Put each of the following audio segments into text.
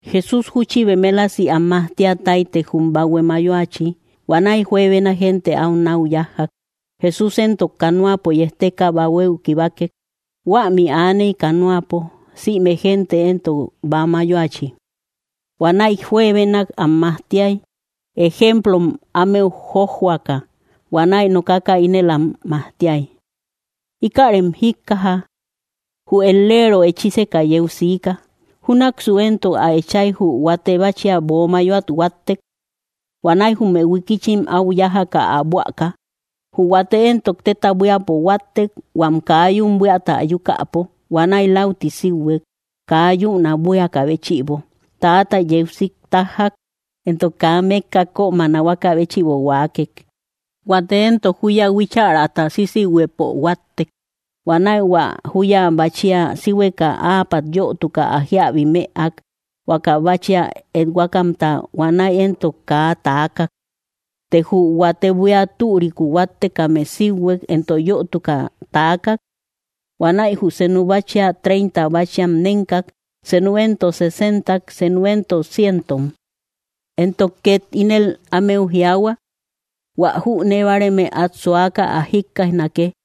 Jesús júchi bemelasi am majtia táytek jum bahue mayoachi. Huanäi juebena gente au nau yájjak. Jesús éntok canoapo yejteka bahuéu kibakek. Huämi aaney canoapo, sïme gente éntok bäa mayoachi. Huanäi juebenak am majtiay, ejemplom ámeu jójjoaka, huanäi nokaka ínel am majtiay: —Íkärem jíkkaja: Jü et‑leero echíseka yeu siika. Júnaksu éntok ä echay, jü huate báchia böo mayoat huáttek. Huanäi jume huikichim au yájaka ä buäka. Jü huate éntok téta buíapo huáttek, huam kaa yún buíata ayukäpo. Huanäi läuti síuhuek, kaa yün ä buíakä béchïbo. Täata yeu sik tájjak, entok kaa mékka kömä nahuaka béchïbo huaakek. Huate éntok júya huíchärata sísihuëpo huáttek. Huanäi hua júya báchia síhueka, áapat yötuka ä jíabi mëak, huaka báchia ethuakamta. Huanäi éntok kaa taakak. Të jü huate buía türiku huáttekame síuhuek, entok yötuka taakak. Huanäi jü senu báchia treinta báchiam nénkak, senu éntok sesentam, senu éntok cientom. Entok ket ínel ámeu jiaahua: —Huä jünee báareme at suaka ä jikkaijnake.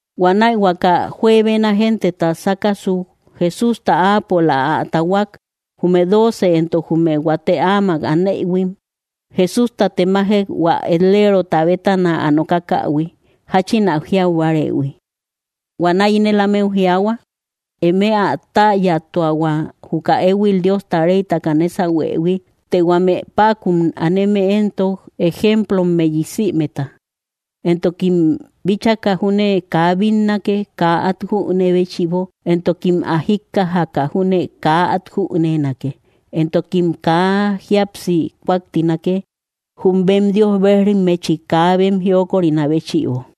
Huanäi, huaka juebena genteta sákasuk Jesústa áapola ä tahuak, jume dóoce entok jume huate áma anëhuim Jesústa temajek, hua et‑lerota bétana ä nookakähui, jáchin ä jiau bárëhui. Huanäi ínel ámeu jiaahua: —Eme ä täyatuahua, juka éhuil Diosta reytaka nésahuëhui. Të huame päkun aneme éntok, ejemplommeyi sïmeta. Entokim bíchaka júne kaa bínnake, kaa at jünee béchïbo, entokim ä jíkkajaka júne kaa at jüneenake, entokim kaa jíapsi kúaktinake, jum bem Dios bejrimmechi kaa bem jiokorinä béchïbo.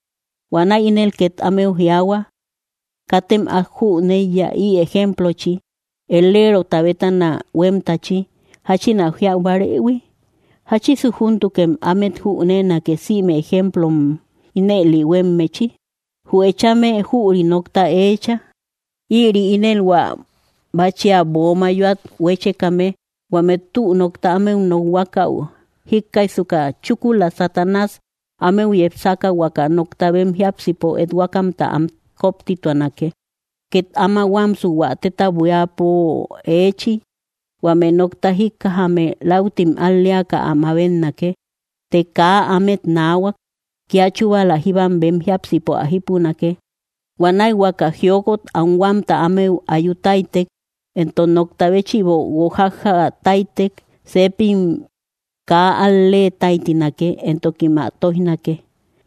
Huanäi ínel ket ámeu jiaahua: —¿Katem át jüneiya ï ejemplochi, et‑lerota bétana huémtachi, jáchin ä jiau bárëhui? ¿Jáchisu júntukem ámet jüneenake, sïme ejemplom ínëli huémmechi? Jü echame jüri nokta eecha. Ïri ínel hua báchia böo mayoat huéchekame: huame tü nokta ámeu nokhuakäu, jíkkaijsuka chúkula Satanás ámeu yepsaka, huakä nokta bem jiápsipo ethuakämta am kóptituanake. Ket áma huámsu hua téta buíapo eechi: huame nokta jíkkajame, láutim al‑leaka ä mabetnake. Të kaa ámet naahuak, kia chúbala jíbam bem jiápsipo ä jípunake. Huanäi huakä jiokot anhuamta ámeu ayu táytek, entok nokta béchïbo guojájja táytek, sepim kaa al‑lee táytinake, entokim ä tóijnake.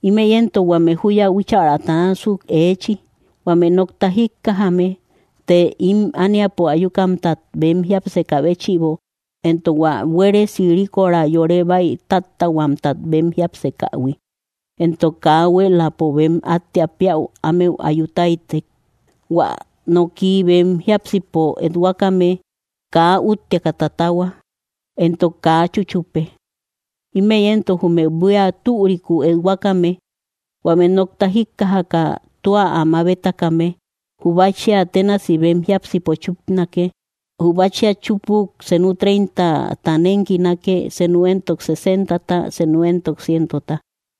Ímëi éntok huame júya huíchärata násuk eechi: huame nokta jíkkajame, të ím ániapo ayukamtat bem jiápsekä béchïbo, entok hua buéresi ríkora yore bäitáttähuamtat bem jiápsekähui, entok kaa huéeläpo bem áttea péäu ámeu ayu táytek, hua noki bem jiápsipo ethuakame kaa útteaka tatahua, entok kaa chúchupe. Ímëi éntok jume buía türiku ethuakame: huame nokta jíkkajaka tua ä mabetakame, jü báchia ténasi bem jiápsipo chúpanake. Jü báchia chúpuk senu treintata nénkinake, senu éntok sesentata, senu éntok cientota.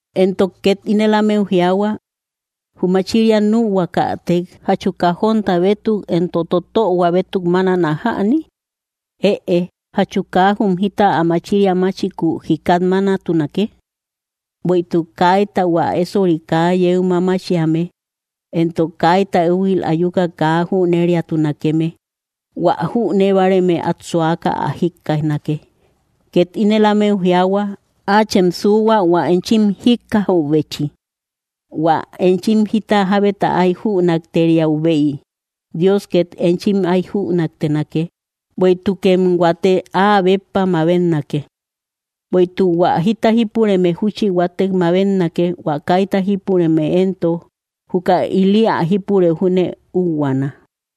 Entok ket ínel ámeu jiaahua: —Jü machiria nühuakätek, ¿jachu kajónta bétuk entok totöhua bétuk mánana jäni? Ëe, ¿jachu kaa jum jita ä machiria máchiku jikat mánatunake? Bueïtuk kaita hua ésori kaa yeu mamachiame, entok kaita éhuil ayuka kaa jüneriatunakeme. Huä jünee báareme at suaka ä jikkaijnake. Ket ínel ámeu jiaahua: —Áachem suuhua, hua enchim jíkkajäubechi. Huä enchim jita jábeta ay jünakteriäubey, Dios ket enchim ay jünaktenake. Bueïtukem huatek áa béppa mabetnake. Bueïtuk hua jita jípureme júchi huatek mabetnake; hua kaita jípureme éntok, júkäi ili ä jípurëu júne úhuaana.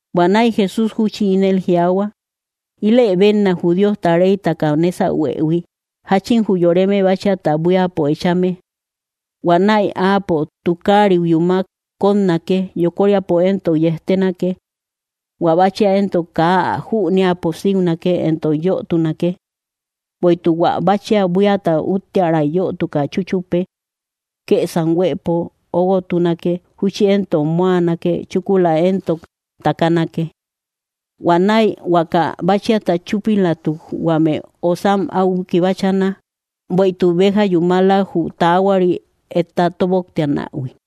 Huanäi Jesús júchi ínel jiaahua: —Ílë bénna, jü Diosta reytaka nésahuëhui, jáchin jü yoreme báchiata buíapo echame. Huanäi áapo tukariu yúmak kótnake, yokoríapo éntok yejtenake. Huä báchia éntok kaa ä jüneäpo síunake éntok yötunake. Bueïtuk hua báchia buíata úttiäray yötuka chúchupe. Kësam huëpo óguotunake, júchi éntok móanake, chúkula éntok takanake. Huanäi huaka báchiata chúpilatuk, huame osam au kibachana, bueïtuk béja yúmala, jü taahuari etta tóboktianähui.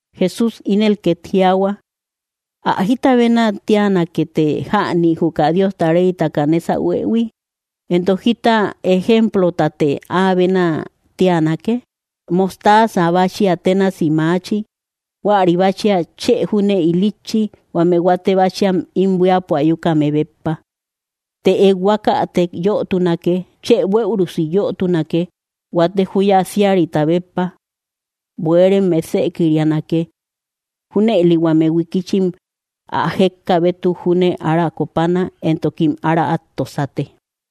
Jesús ínel ket jiaahua: —¿Ä jítasute bénä tiánake jäni, juka Diosta reytaka nésahuëhui? entok, ¿jita ejemplotate ä bénä tiánake? Mostaza báchia ténasi maachi. Huäri báchia chë júne ilitchi, huame huate báchiam ím buíapo ayukame béppa. Të ethuakätek yötunake, chë bueürusi yötunake, huate júya síarita béppa. Bueerem mesëkirianake. Júnëli huame huikichim ä jékkaa bétuk júne ára kópana, entokim ára at tosate.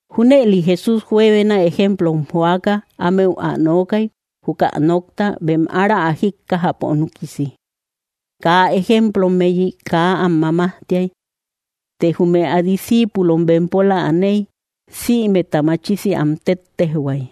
Júnëli Jesús juebena ejemplom joaka ámeu ä nookay, juka nokta, bem ára ä jíkkajäpo núkisi. Kaa ejemplommeyi kaa am mamajtiay; të jume ä discíipulom bempola aney, sïmeta machisi am téttejhuay.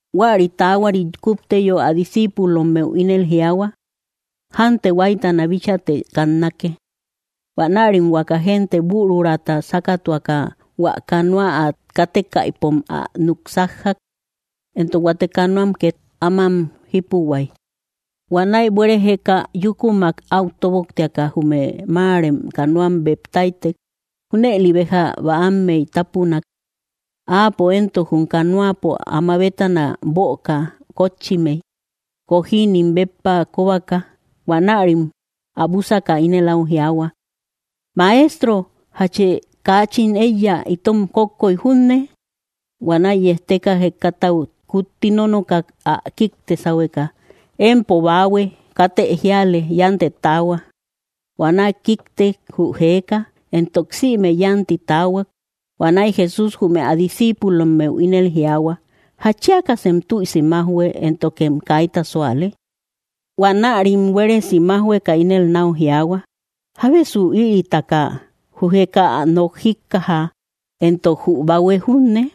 Huäri taahuarit, kúpteyo, ä discíipulommeu ínel jiaahua: —Jante, huáytana bíchaate kannake. Huanärim huaka gente büruraata sákatuaka, hua canoa ä kátekaïpom ä núk sájjak. Entok huate canoam ket amam jípuhuay. Huanäi buere jéka yúkumak au tóboktiaka, jume máarem canoam beb táytek Júnëli béja bäammey tápunak. Áapo éntok jum canoapo áma bétana böka kótchimey, kojinim béppa kobaka. Huanärim ä búsaka ínel áu jiaahua: —¡Maestro! ¿Jachë kaachin éiya itom kókkoy junne? Huanäi yejteka, jekatau kutti nónookak ä kíkte sáhueka: —¡Empo baahue katë jiale yántë taahua! Huanäi kíktek jü jeeka, entok sïme yanti taahuak. Huanäi Jesús jume ä discíipulommeu ínel jiaahua: —¿Jatchiakasem tüisi májhue, éntokem kaita súale? Huanärim buéresi májhueka ínel nau jiaahua: —¿Jábesu ïritaka? Jü jeeka ä nok jíkkaja, entok jü bahue junne.